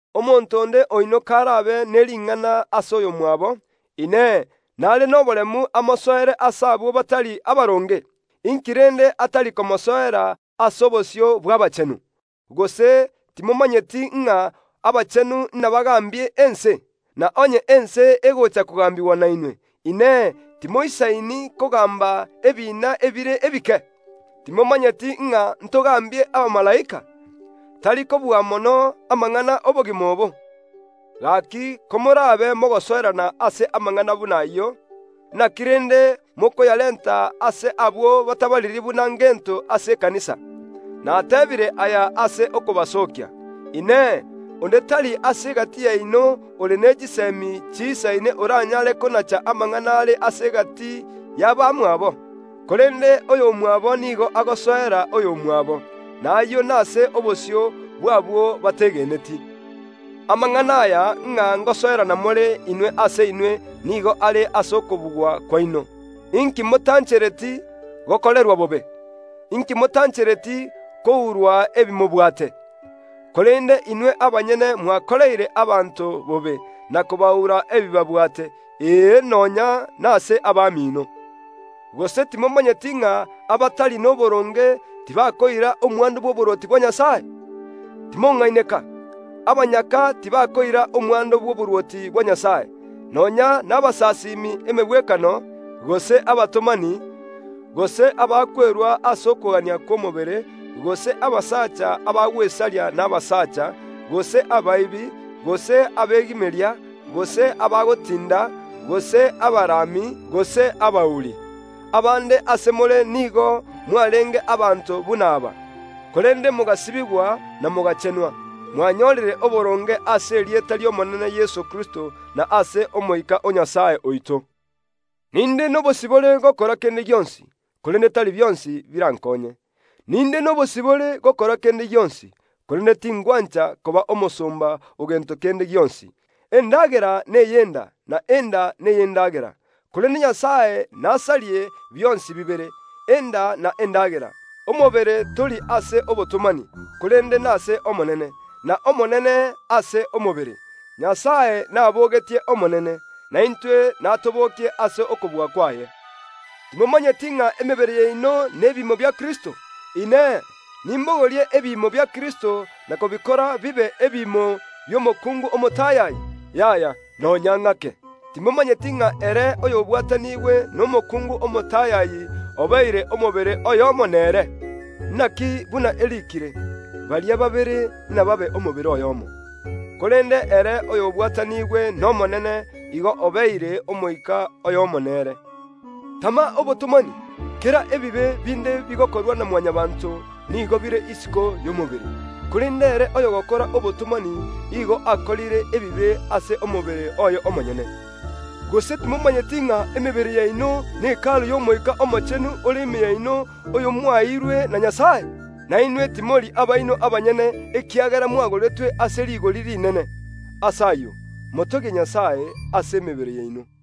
Omonto onde oino karabe ne ring’ana ase oyomwabo, Inee, nare noboremu amosoere ase abwo batari abaronge? Inki rende atari komosoera ase obosio bw’abachenu? Gose timomanyeti ng’a abachenu inabagaambie ense? Na onye ense egocha kogambigwa nainwe, Inee, timoisaini kogamba ebiina ebire ebike? Timomanyeti ng’a ntogambie abamalaika? Tari kobua mono amang’ana ’obogima obo? Gaki komorabe mogosoerana ase amang’ana buna ayio, naki rende mokoyarenta ase abwo batabariri buna ngento ase ekanisa? Nateebire aya ase okobasookia. Inee! Onde tari ase egati yaino ore ne chisemi chiisaine oranyare konacha amang’ana are ase egati y’abamwabo? Korende oyomwabo nigo agosoera oyomwabo, na ayio nase obosio bw’abwo bategeneti. Amang’ana aya ng’a ngosoerana more inwe ase inwe nigo are ase okobugwa kwaino. Inki motanchereti gokorerwa bobe? Inki motanchereti kourwa ebi mobwate? Korende inwe abanyene mwakoreire abanto bobe, na kobaura ebi babwate, ee nonya nase abamino. Gose timomanyeti ng’a abatari noboronge tibakoira omwando bw’oborwoti bwa Nyasae? Timong’aineka; abanyaka tibakoira omwando bw’oborwoti bwa Nyasae, nonya nabasasimi emegwekano, gose abatomani, gose abakwerua ase okogania kw’omobere, gose abasacha abagwesaria nabasaacha, gose abaibi, gose abegimeria, gose abagotinda, gose abarami, gose abauri. Abande ase more nigo mwarenge abanto buna aba, korende mogasibigwa na mogachenwa, mwanyorire oboronge ase erieta ri’Omonene Yeso Kristo, na ase Omoika o Nyasae oito. “Ninde nobosibore gokora kende gionsi”, korende tari bionsi birankonye. “Ninde nobosibore gokora kende gionsi”, korende tingwancha koba omosomba o gento kende gionsi. “Endagera ney’enda na enda ney’endagera”, korende Nyasae nasarie bionsi bibere, enda na endagera. Omobere tori ase obotomani, korende nase Omonene, n’Omonene ase omobere. Nyasae nabogetie Omonene, naintwe natobokie ase okobua kwaye. Timomanyeti ng’a emebere yaino nebiimo bia Kristo? Inee! Nimbogorie ebiimo bia Kristo na kobikora bibe ebiimo bi’omokuungu omotayayi? Yaya, nonya ng’ake! Timomanyeti ng’a ere oyobwatanigwe nomokuungu omotayayi obeire omobere oyomo nere? Naki buna eriikire, “Baria babere nababe omobere oyomo.” Korende ere oyobwatanigwe n’Omonene igo obeire omoika oyomo nere. Tama obotomani! Kera ebibe binde bigokorwa na Mwanyabaanto nigo bire isiko y’omobere; korende ere oyogokora obotomani igo okorire ebibe ase omobere oye omonyene. Gose timomanyeti ng’a emebere yaino ne Hekalu y’Omoika Omochenu ore ime yaino, oyo mwaeirwe na Nyasae? Na inwe timori abaino abanyene, ekiagera mwagoretwe ase rigori rinene. Ase ayio, motogie Nyasae ase emebere yaino.